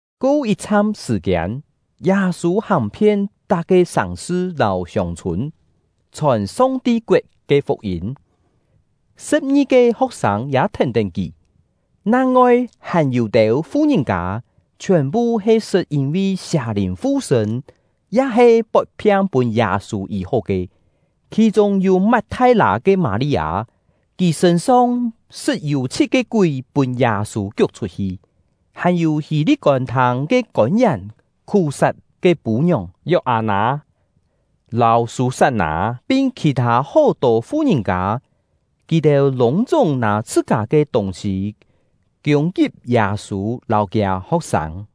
Ko yit-chham sṳ̀-kiên, Yâ-sû hàng-phien tak-ke sàng-sṳ lâu hiông-chhûn, chhòn Song-ti koet ke fuk-yîm; sṳ̍p-ngi-ke ho̍k-sâng ya thèn-tén kì. Nang-ngoi hàn yû-têu fu-ngìn-kâ, chhiòn-phu he sṳt yîn-vi sià-lìn fu-sṳ̂n ya-he pot-phiang pûn Yâ-sû yî-hó ke; khì-chûng yû Mat-thai-lâ ke Mâ-li-â, kì sṳ̂n-song sṳt yû chhit-ke kúi pûn Yâ-sû kiuk chhut-hi; hàn-yû Hî-li̍t kôn-thâng ke kôn-yèn Khú-sat ke pû-ngiòng Yok-â-nâ, lâu Sû-sat-nâ, pin khì-thâ hó-tô fu-ngìn-kâ. Kì-têu lûng-chúng nâ chhṳ-kâ ke tûng-sî kiûng-kip Yâ-sû lâu kiâ ho̍k-sâng.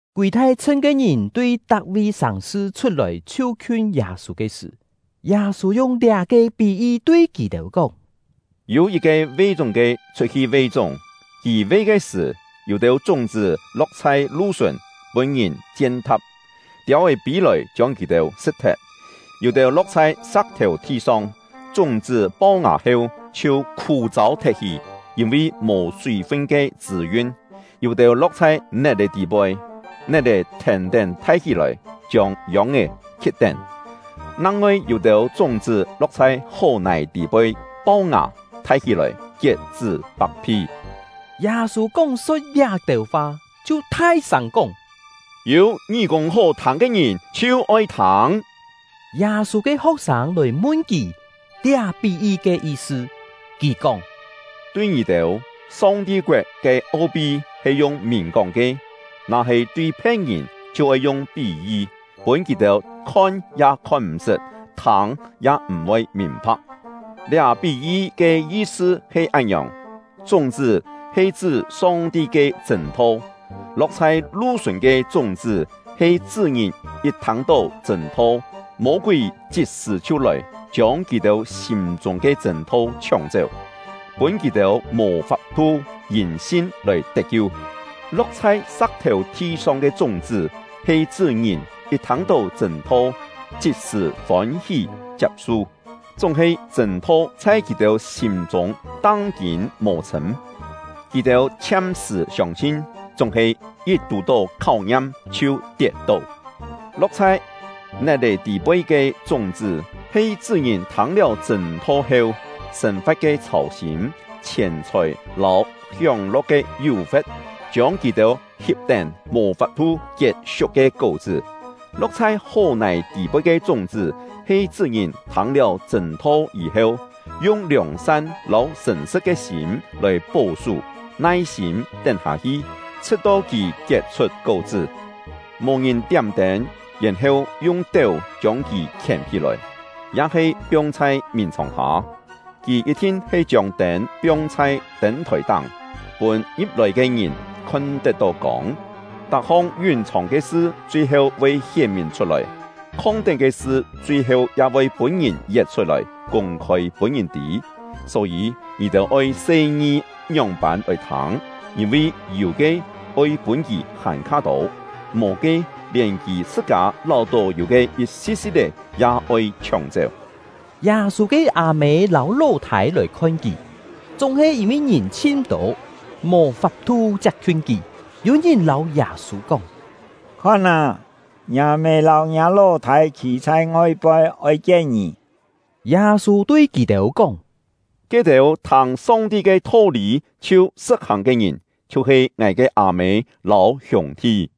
Kûi thai-chhṳn ke ngìn tui tak-vi sàng-sṳ chhut-lòi chhiu-khiun Yâ-sû ke sṳ̀, Yâ-sû yung liá-ke pí-yi tui kì-têu kóng: “Yû yit-ke ve-chúng-ke chhut-hi ve-chúng. Kì ve ke sṳ̀, yû-têu chúng-chṳ́ lo̍k chhai lu-sùn, pûn-ngìn chien-tha̍p, tiâu-é pî-lòi chiông kì-têu sṳ̍t-thet. Yû-têu lo̍k chhai sa̍k-thèu thi-song, chúng-chṳ́ pau-ngà heu chhiu khû-châu thet-hi, yîn-vi mò súi-fun ke chṳ̂-yun. Yû-têu lo̍k chhai net-è tî-poi, net-è thèn-tén thai hí-lòi, chiông yông-é khi̍t-tén. Nang-ngoi yû-têu chúng-chṳ́ lo̍k chhai hó-nài tî-poi, pau-ngà, thai hí-lòi, kiet-chṳ́ pak-phi.” Yâ-sû kóng-so̍t liá-têu fa, chhiu thai-sâng kóng: “Yû ngí-kûng hó-thâng ke ngìn, chhiu oi thâng!” Yâ-sû ke ho̍k-sâng lòi mun kì liá pí-yi ke yi-sṳ. Kì kóng: “Tui ngì-têu, Song-ti koet ke o-pi he yung mìn-kóng ke; na-he tui phe̍t-ngìn, chhiu oi yung pí-yi, pûn kì-têu khon ya khon m̀-sṳt, thâng ya m̀-voi mìn-pha̍k. “Liá pí-yi ke yi-sṳ he án-ngiòng: Chúng-chṳ́ he chṳ́ Song-ti ke chṳ̂n-tho. Lo̍k chhai lu-sùn ke chúng-chṳ́ he chṳ́ ngìn yit thâng-tó chṳ̂n-tho, Mô-kúi chit-sṳ̀ chhiu lòi, chiông kì-têu sîm-chûng ke chṳ̂n-tho chhióng-chéu, pûn kì-têu mò fap-thu yîn sin lòi tet-kiu. Lo̍k chhai sa̍k-thèu thi-song ke chúng-chṳ́ he chṳ́ ngìn yit thâng-tó chṳ̂n-tho chit-sṳ̀ fôn-hí chiap-su, chúng-he chṳ̂n-tho chhai kì-têu sîm-chûng tang-kîn mò chhṳ̂m; kì-têu chhiam-sṳ̀ siông-sin, chúng-he yit tù-tó kháu-ngiam chhiu tiet-tó. Lo̍k chhai net-è tî-poi ke chúng-chṳ́ he chṳ́ ngìn thâng-liáu chṳ̂n-tho heu, sên-fa̍t ke chhâu-sîm, chhièn-chhòi lâu hióng-lo̍k ke yú-fe̍t, chiông kì-têu hip-tén, mò fap-thu kiet siuk ke kó-chṳ́. Lo̍k chhai hó-nài tî-poi ke chúng-chṳ́ he chṳ́ ngìn thâng-liáu chṳ̂n-tho yî-heu, yung liòng-san lâu sṳ̀n-sṳ̍t ke sîm lòi pó-sú, nai-sîm tén-hâ-hi, chhṳ̍t-to kì kiet-chhut kó-chṳ́. “Mò ngìn tiám-tên, yèn-heu yung téu chiông kì khièm-hí-lòi, ya-he piong chhai mìn-chhòng-hâ. Kì yit-thin he chiông tên piong chhai tên-thòi-táng, pûn ngi̍p-lòi ke ngìn khon-tet-tó kông. Tak-hong yún-chhòng ke sṳ chui-heu voi hién-mìn chhut-lòi; khong-tén ke sṳ chui-heu ya voi pûn-ngìn yet chhut-lòi, kûng-khôi pûn ngìn tî. “Só-yî, ngì-têu oi se-ngi ngióng-pân lòi thâng; yîn-vi yû ke, oi pûn kì hàn-kha tô; mò ke, lièn kì chhṳ-kâ láu-tó yû ke yit-si̍t-si̍t-é, ya oi chhióng-chéu.” Yâ-sû ke â-mê lâu ló-thâi lòi khon kì, chúng-he yîn-vi ngìn chhin tô, mò fap-thu chiap-khiun kì. Yû ngìn lâu Yâ-sû kóng: “Khon â, ngiâ mê lâu ngiâ ló-thâi khî chhai ngoi-poi, oi kien ngì!” Yâ-sû tui kì-têu kóng: “Ke-têu thâng Song-ti ke tho-lî chhiu sṳ̍t-hàng ke ngìn, chhiu-he ngài ke â-mê lâu hiûng-thi!”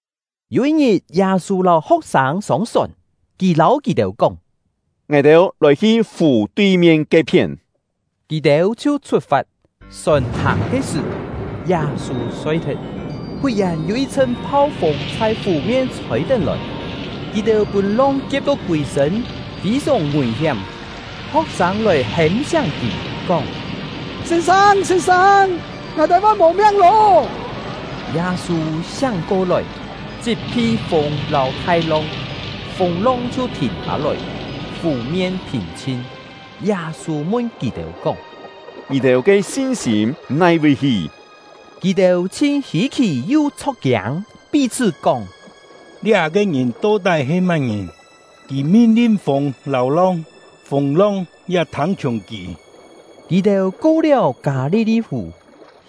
Yû yit-ngit, Yâ-sû lâu ho̍k-sâng sông-sòn; kì lâu kì-têu kóng: “Ngài-têu lòi-hi fù tui-mien ke-phién!” Kì-têu chhiu chhut-fat. Sòn hàng ke sṳ̀, Yâ-sû soi-thet. Fut-yèn, yû yit-chhṳn phau-fûng chhai fù-mien chhôi-tén lòi, kì-têu pûn long kie̍p-to kûi-sṳ̂n, fî-sòng ngùi-hiám. Ho̍k-sâng lòi hêm-siáng kì, kóng: “Sîn-sâng, sîn-sâng, ngài-têu voi mò miang lô!” Yâ-sû siáng ko-lòi, chit-phi fûng lâu thai-long, fûng-long chhiu thìn hâ-lòi, fù-mien phìn-chhin. Yâ-sû mun kì-têu kóng: “Ngì-têu ke sin-sîm nai-vi hi?” Kì-têu chhin hî-khì yu chho̍k-kiâng, pí-chhṳ́ kóng: “Liá-ke ngìn to-tái he má-ngìn? Kì min-lin fûng lâu long, fûng-long ya thâng-chhiùng kì!” Kì-têu ko-liáu Kâ-li-li-fù,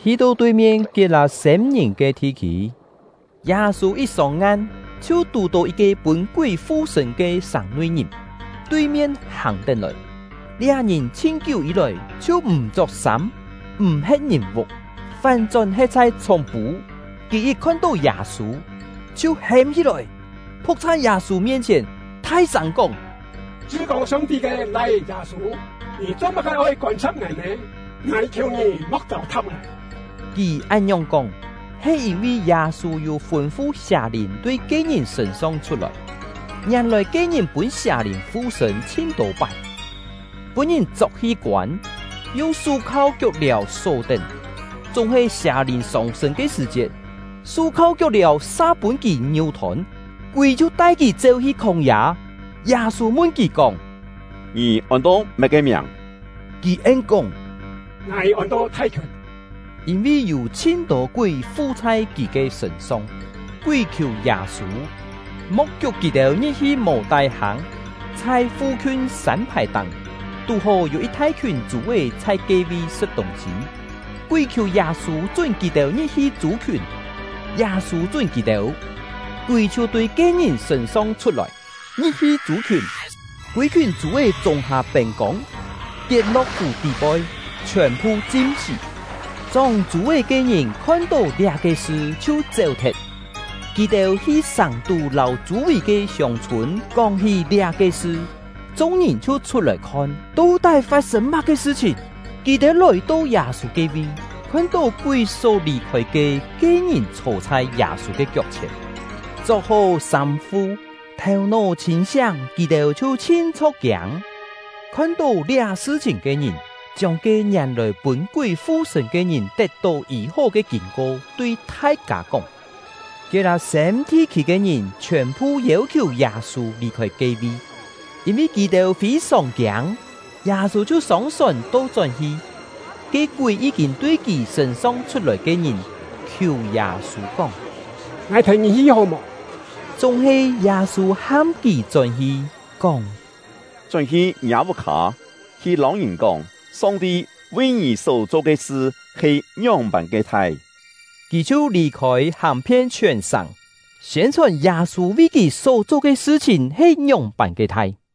hi-to tui-mien Kiet-lâ-sêm-ngìn ke thi-khî. Yâ-sû yit sông-ngan, chhiu tù-tó yit-ke pûn kúi fu-sṳ̂n ke sàng-nui-ngìn, tui-mien hàng-tén-lòi. Liá ngìn chhin-kiú yî-lòi chhiu m̀ chok-sâm, m̀ he̍t ngìn-vuk, fán-chón he̍t chhai chhúng-pû. Kì yit khon-tó Yâ-sû, chhiu hêm hí-lòi, phu̍k chhai Yâ-sû mien-chhièn, thai-sâng kóng: “Chṳ-kô Song-ti ke Lai-é Yâ-sû, ngì cho-má-ke oi kôn-sa̍p ngài nè? Ngài khiù ngì mo̍k châu-tha̍p ngài!” Kì án-ngiòng kóng, he yîn-vi Yâ-sû yû fûn-fu sià-lìn tui ke-ngìn sṳ̂n-song chhut-lòi. Ngièn-lòi ke-ngìn pûn sià-lìn fu-sṳ̂n chhin-tô pái, pûn-ngìn chok-hi koân, yung sú-khau kiok-liàu só-tén; chúng-he sià-lìn sông-sṳ̂n ke sṳ̀-chiet, sú-khau kiok-liàu sa pûn kì ngiú-thôn, kúi chhiu tai kì chéu-hi khóng-yâ. Yâ-sû mun kì kóng: “Ngì ôn-to má-ke miàng?” Kì en-kóng: “Ngài ôn-to ‘Thai-khiùn’”, yîn-vi yû chhin-tô kúi fu chhai kì ke sṳ̂n-song. Kúi khiù Yâ-sû, mo̍k kiuk kì-têu ngi̍p-hi mò-tái-hâng. Chhai fu-khiun sân-phài-táng, tú-hó yû yit thai-khiùn chû-é chhai ke-vi sṳ̍t tûng-sî. Kúi khiù Yâ-sû chún kì-têu ngi̍p-hi chû-khiùn; Yâ-sû chún kì-têu. Kúi chhiu tui ke-ngìn sṳ̂n-song chhut-lòi, ngi̍p-hi chû-khiùn; kûi-khiùn chû-é chûng-hâ pên-kông, tiet-lo̍k fù tî-poi, chhiòn-phu chim-sí. Chóng chû-é ke ngìn khon-tó liá-ke sṳ chhiu chéu-thet; kì-têu hi sàng-tú lâu chû-vì ke hiông-chhûn kóng-hí liá-ke sṳ. Chung-ngìn chhiu chhut-lòi khon, to-tái fat-sên má-ke sṳ-chhìn. Kì-têu lòi-to Yâ-sû ke-vi, khon-tó kúi só lì-khôi ke ke-ngìn chhô chhai Yâ-sû ke kiok-chhièn, chok-hó sâm-fu, thèu-nó chhîn-siáng; kì-têu chhiu chhin chho̍k-kiâng. Khon-tó liá sṳ-chhìn ke ngìn, chiông ke ngièn-lòi pûn kúi fu-sṳ̂n ke ngìn tet-tó yî-hó ke kîn-ko tui thai-kâ kóng. Kiet-lâ-sêm thi-khî ke ngìn chhiòn-phu yêu-khiù Yâ-sû lì-khôi ke-vi, yîn-vi kì-têu fî-sòng kiâng; Yâ-sû chhiu sông-sòn to-chón-hi. Ke kúi yí-kîn tui kì sṳ̂n-song chhut-lòi ke ngìn khiù Yâ-sû kóng: “Ngài thèn ngì hi hó mò?” Chúng-he Yâ-sû ham kì chón-hi, kóng: “Chón-hi ngiâ vuk-hâ, hi lâu ngìn kóng, Song-ti vi ngì só-cho ke sṳ he ngióng-pân ke thai.” Kì chhiu lì-khôi, hàng-phien chhiòn sàng, siên-chhòn Yâ-sû vi kì só-cho ke sṳ-chhìn he ngióng-pân ke thai.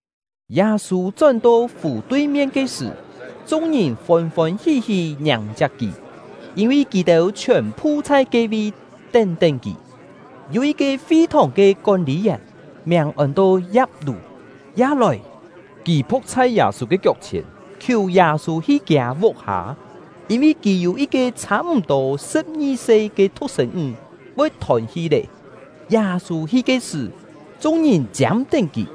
Yâ-sû chón-to fù tui-mien ke sṳ̀, chung-ngìn fôn-fôn hí-hí ngiàng-chiap kì, yîn-vi kì-têu chhiòn-phu chhai ke-vi tén-tén kì. Yû yit-ke fi-thòng ke kón-lî-yèn, miàng ôn-to Ya̍p-lû, ya lòi. Kì phu̍k chhai Yâ-sû ke kiok-chhièn, khiù Yâ-sû hi kiâ vuk-hâ, yîn-vi kì yû yit-ke chhâ-m̀-tô sṳ̍p-ngi-se ke thu̍k-sên-ńg, voi thôn-hi lé. Yâ-sû hi ke sṳ̀, chung-ngìn chiâm-tén kì.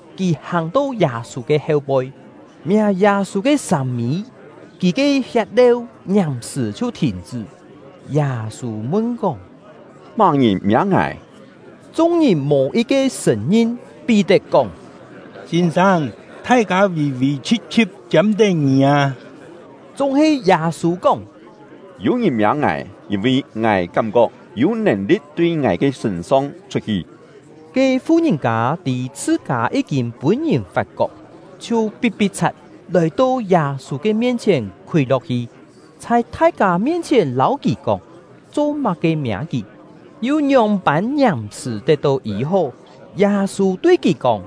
Kì hàng-to Yâ-sû ke heu-poi, miâ Yâ-sû ke sâm-mî; kì ke hiet-leu ngiàm-sṳ̀ chhiu thìn-chṳ́. Yâ-sû mun-kóng: “Má-ngìn miâ ngài?” Chung-ngìn mò yit-ke sṳ̀n-ngin. Pí-tet kóng: “Sîn-sâng, thai-kâ vì-vì chhi̍p-chhi̍p, chiâm-tén ngì â!” Chúng-he Yâ-sû kóng: “Yû ngìn miâ ngài, yîn-vi ngài kám-kok yû nèn-li̍t tui ngài ke sṳ̂n-song chhut-hi!” Ke fu-ngìn-kâ tî chhṳ-kâ yí-kîn pûn-ngìn fat-kok, chhiu pi̍t-pi̍t-chhat, lòi-to Yâ-sû ke mien-chhièn khúi lo̍k-hi, chhai thai-kâ mien-chhièn lâu kì kóng, cho-má-ke miâ kì, yu ngióng-pân ngiàm-sṳ̀ tet-tó yî-hó. Yâ-sû tui kì kóng: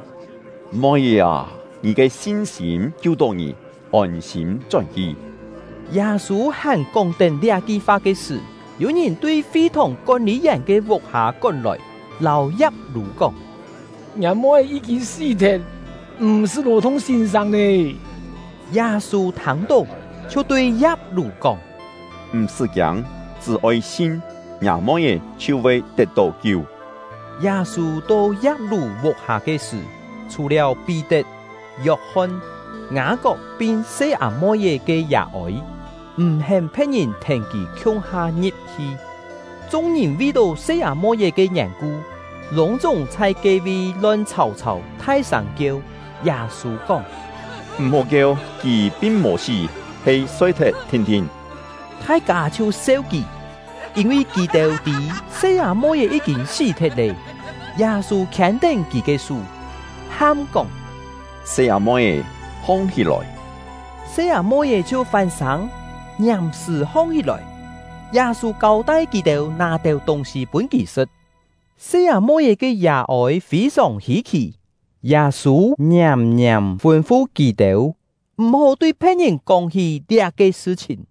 “Moi-é â, ngì ke sin-sîm kiu-tó ngì! Ôn-sîm chón-hi!” Yâ-sû hàn kóng-tén liá-ki fa ke sṳ̀, yû ngìn tui fi-thòng kón-lî-yèn ke vuk-hâ kón-lòi, lâu Ya̍p-lû kóng: “Ngiâ moi-é yí-kîn sí-thet, m̀-sṳ́ lò-thung sîn-sâng lé!” Yâ-sû thâng-tó, chhiu tui Ya̍p-lû kóng: “M̀-sṳ́ kiâng, chṳ́-oi sin! Ngiâ moi-é chhiu voi tet-tó kiu.” Yâ-sû to Ya̍p-lû vuk-hâ ke sṳ̀, chhù-liáu Pí-tet, Yok-hon, Ngâ-kok pin se-â-moi-é ke yà-ôi, m̀-hén phe̍t-ngìn thèn kì khiung-ha ngi̍p-hi. Chung-ngìn vi-tó se-â-moi-é ke yèn-ku, lûng-chúng chhai ke-vi lon chhàu-chhàu thai-sâng kieu. Yâ-sû kóng: “M̀-hó kieu! Kì pin mò sí, he soi-thet thin-thin.” Thai-kâ chhiu seu kì, yîn-vi kì-têu tî se-â-moi-é yí-kîn sí-thet lé. Yâ-sû khiên-tén kì ke sú, ham kóng: “Se-â-moi-é, hong-hí-lòi!” Se-â-moi-é chhiu fán-sâng, ngiàm-sṳ̀ hong-hí-lòi. Yâ-sû kâu-tai kì-têu nâ têu tûng-sî pûn kì sṳ̍t. Se-â-moi-é ke yà-ôi fî-sòng hî-khì; Yâ-sû ngiàm-ngiàm fûn-fu kì-têu, m̀-hó tui phe̍t-ngìn kóng-hí liá-ke sṳ-chhìn.